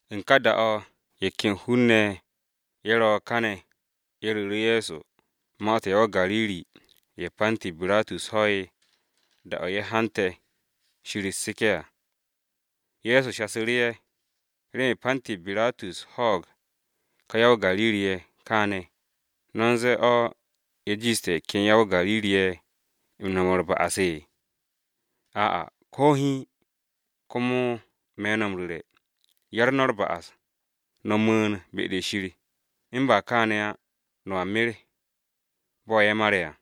U̱n ka da-o̱ ye̱ ken hun-ne̱ ye̱ ro̱ káne̱, ye̱ ru̱ru̱ Ye̱so ma-to̱ ya-o-Gariri-ye̱ Panti Biratus ho'e̱ da-o̱ ye̱ haante̱ Shir u̱t-seke̱ à. Ye̱so shasu̱ru̱ ye̱, “¿Remen Panti Biratus ho̱o̱g ka ya-o-Gariri-ye̱ kaane̱, no̱ u̱n ze̱e̱ o̱ ye̱ jiishte̱ ye̱ ken ya-o-Gariri-ye̱ no̱m u̱r-ba'as se? Ayyo̱, ko̱ hiin! Komo me̱ no̱ m-ru̱re̱, 'yar no̱ u̱r-ba'as, no̱ mu̱u̱n be-de Shir m-ba kaane̱ á no̱a mer bo̱ ye̱ mare̱ à.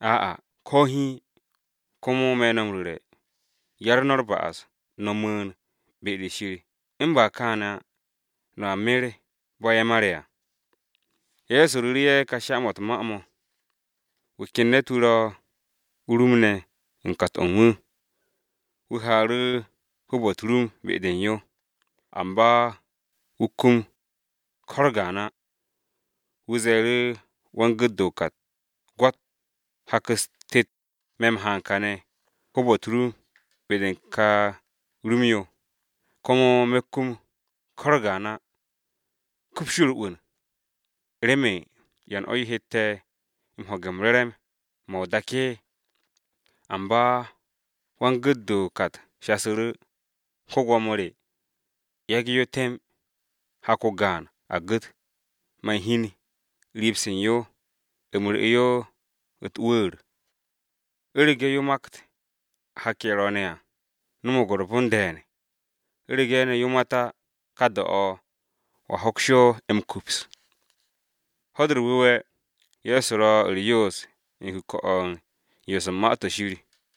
Ayyo̱, ko̱ hiin! Komo me̱ no̱ m-ru̱re̱, 'yar no̱ u̱r-ba'as, no̱ mu̱u̱n be-de Shir u̱n ba kaane̱ á no̱a mer bo̱ ye̱ mare̱ à.” Ye̱so ru̱ru̱ ye̱ ka sha-mo̱ u̱t-ma mo̱: “Wu̱ ken ne̱t-wu̱ ro o-rum ne̱ u̱n kat-o̱ u̱n wu̱. Wu̱ haaru̱ hoob-o̱ u̱t-rum be-de u̱n yo, amba wu̱ kum ko̱ u̱r-gaan á. Wu̱ ze̱e̱ru̱ wan-gu̱t-de o-kat, ‘Gwo̱t, hak-u̱s tet me̱ m-haan kane̱ hoob-o̱ u̱t-rum be-de u̱n ka rum-yo, komo me̱ kum ko u̱r-gaan á. Kups yo u̱r-'wu̱n! ¿Remen yan o̱ yo hette̱ m-ho̱ge̱ re̱re̱m-mo̱ o-dak?’ Amba wan-gu̱t-de o-kat shasu̱ru̱, ‘Go̱s-wu̱, yage̱ yo temb, hak-o gaan a gu̱t, man hiin riib-se u̱n yo, u̱m ru̱'e̱ yo u̱t-wu̱u̱r. U̱rege̱ yo makt hak-ye̱ ro̱o̱ne̱ à, no̱mo̱g u̱r-bon de̱e̱n, u̱rege̱ ne̱ yo mat á, ka da-o̱ wo̱a hoks yo m-kups.’” Ho̱-de u̱r-Wu̱we̱, Ye̱so ro u̱r-yoos u̱n kuke̱-o̱ u̱n yoos u̱n Ma-to̱ Shir.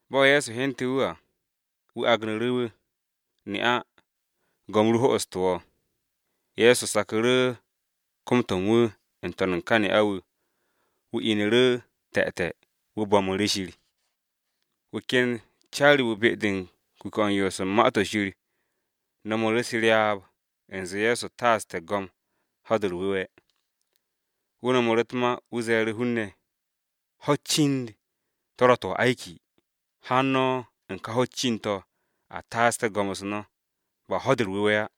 Bo̱ Ye̱so hyente̱ wu̱ à, wu̱ agnu̱ru̱ wu̱, “Ne'a, go̱m ru ho'oste̱ wo̱!” Ye̱so saku̱ru̱ kom-to̱ u̱n wu̱ n-to̱n u̱n ka ne'a-wu̱, wu̱ inu̱ru̱ te̱te̱, wu̱ bo̱mu̱ru̱ Shir. Wu̱ ken wan-co-wu̱ u̱n kuke̱-o̱ u̱n yoos u̱n Ma-to̱ Shir, no̱mu̱ru̱ u̱s-ryaab u̱nze Ye̱so taaste̱ go̱m Ho̱-de u̱r-Wu̱we̱. Wu̱ no̱mu̱ru̱ u̱t-ma wu̱ ze̱e̱ru̱ hun-ne̱, “Ho̱-u̱t cind-to̱ ro̱ to̱ m-se̱nge̱, haan no̱ u̱n ka ho̱-u̱t cind-to̱ a taaste̱ go̱m-u̱s no̱, ba Ho̱-de u̱r-Wu̱we̱ á!”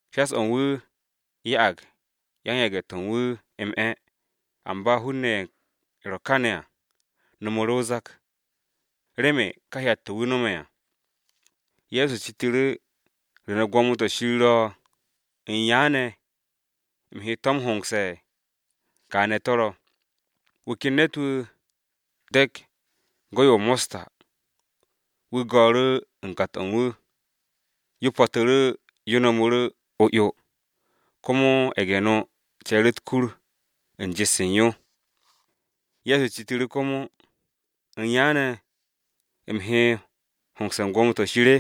Shas-o̱ u̱n wu̱ ya'ag yan-yage̱-to̱ u̱n wu̱ m-'e̱, amba hun-ne̱ ye̱ ro káne̱ à no̱mu̱ru̱ o-zak remen ka hyat-to̱ wu̱ no̱me̱ à. Ye̱so citu̱ru̱, “¿Re ne̱ gwo̱mo-to̱ Shir ro̱? ¿U̱n ya ne̱ u̱m he to̱ m-hongse̱? Kaane̱ to̱ ro̱. Wu̱ ken ne̱t-wu̱ de̱k go̱-yo mosta wu̱ go̱o̱ru̱ u̱n kat-o̱ u̱n wu̱. Yo po̱tu̱ru̱ yo wargu̱ru̱ o-'yo, komo ye̱ge̱-no ce̱e̱ru̱ u̱t-kur u̱n jet-se u̱n yo.” Ye̱so citu̱ru̱ komo, “¿U̱n ya ne̱ u̱m he m-hongse̱ u̱n gwo̱mo-to̱ Shir?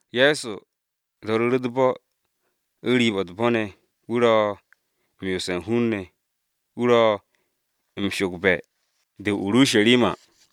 Ye̱so do̱ru̱ru̱ u̱t-bo̱ u̱n riib-o̱ u̱t-bo̱ ne̱, wu̱ ro̱ m-yoose̱ u̱n hun-ne̱, wu̱ ro̱ m-sho̱gbe̱ de o-Urusharima.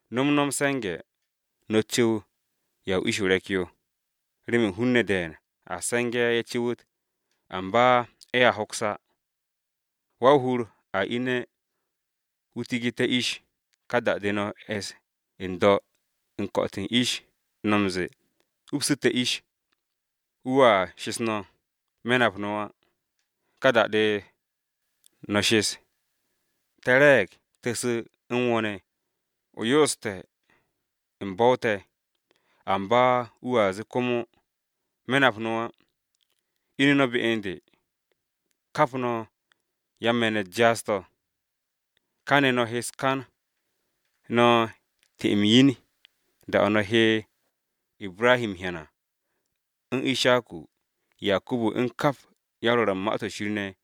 “No̱m no̱ m-se̱nge̱ no̱ cu̱w ya o-ish o-re̱k yo, remen hun-ne̱ de̱e̱n a se̱nge̱ ye̱ cu̱wu̱t amba ye̱a hoks á. Wa-o-hur a ine̱ wu̱ tigu̱te̱ ish, ka da-de no̱ es n-do̱ u̱n ko̱'o̱t u̱n ish no̱ m-ze̱e̱, ‘teksu̱ te̱ ish.’ Wu̱a shes no̱, ‘Me̱ nap no̱ á!’ Ka da-de no̱ shes, ‘Te̱ re̱e̱g, te̱ su̱ u̱n wo̱ ne̱, o yooste̱ u̱n bo̱-o te̱!’ Amba wu̱a zee komo, ‘Me̱ nap no̱ á. Ine̱ no̱ be u̱n de. Kap no̱ yan-me̱n-u̱t jaas-to̱!’ Kane̱ no̱ he u̱s-kan no̱ ti-m yin da-o̱ no̱ he Ibrahi m-hyan à u̱n Ishaku, Yakubu u̱n kap yan-Rwo̱r u̱n Ma-to̱ Shir ne̱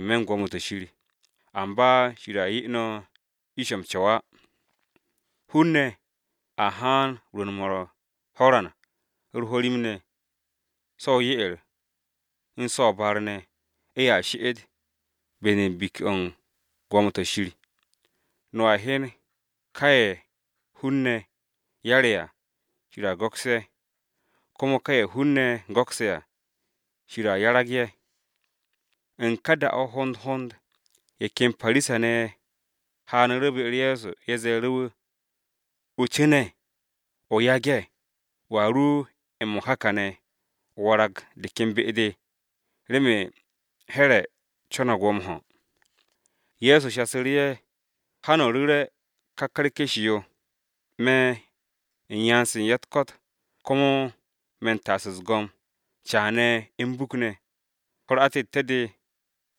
n-me̱ u̱n gwo̱mo-to̱ Shir, amba Shir a 'ye no̱ ish-o m-co̱w á! Hun-ne̱ a haan rwu̱u̱n-mo̱ u̱r-ho̱ran u̱r-ho̱rim ne̱, so̱ o-ye'er u̱n so̱ o-baar ne̱, ye̱a she'et be-de u̱n biki-o̱ u̱n gwo̱mo-to̱ Shir. No̱a hyen, ka ye̱ hun-ne̱ 'yare̱ à, Shir a go̱ks ye̱, komo ka ye̱ hun-ne̱ go̱kse̱ à, Shir a 'yarag ye̱.” U̱n ka da-o̱ hond hond ye̱ ken Parisa-ne̱ ye̱ haanu̱ru̱ be-u̱r Ye̱so, ye̱ ze̱e̱ru̱ wu̱, “O cu̱ne̱, o yage̱, wo̱a ru m-mo̱ka kane̱ o warag de ken be-de, remen Here̱ [Atipas] co̱no̱g wo̱ m-ho̱.” Ye̱so shasu̱ru̱ ye̱, “Ha no̱ ru̱re̱ Here̱ ká wo̱-yo o-tuk-yo, ‘Me̱ u̱n yan-se u̱n ya-u̱t-ko̱t komo me̱ u̱n ta'as u̱s-go̱m caane̱ u̱n buk ne̱, ho̱-u̱r atette̱-de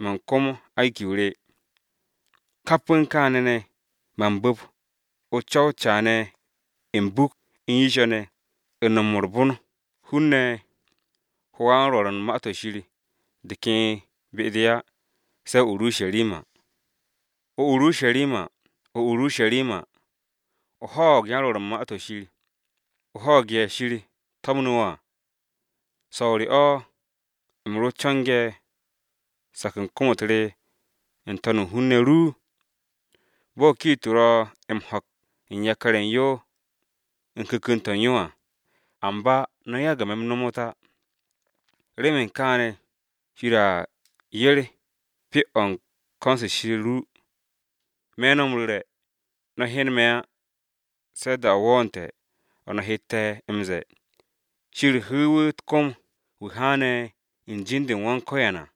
man kom se̱nge̱-m re.’ Kap u̱n kaane̱ ne̱, man bu̱p o-co̱w caane̱, m-buk, n-yisho̱ ne̱, u̱n no̱m u̱r-bon hun-ne̱ ho wan-rwo̱r u̱n Ma-to̱ Shir de ken be-de á se̱ o-Urusharima. “Ya-o-Urusharima, ya-o-Urusharima! O ho̱o̱g yan-Rwo̱r u̱n Ma-to̱ Shir, o ho̱o̱g ye̱ Shir to̱mnu̱ wo̱ à! So̱o̱ re o̱ u̱m ro co̱nge̱ sak u̱n kom-u̱t re n-to̱n u̱n hun-ne̱ ru, bo̱ kiit-o ro̱ m-ho̱k u̱n yakar-ye̱ u̱n yo u̱n ku̱ku̱n-to̱ u̱n yo à, amba no̱ yagu̱ me̱ m-nomot á. Remen kaane̱ Shir a 'yer pyo-o u̱n ko̱n-se u̱n Shir ru. Me̱ no̱ m-ru̱re̱, no̱a hyen me̱ á, se̱ da-o wo̱o̱nte̱ o̱ no̱ hette̱ m-ze̱e̱, ‘Shir hu̱u̱ wu̱ u̱t-kom, wu̱ haane̱ u̱n be̱e̱b-u̱r Yawe à.’”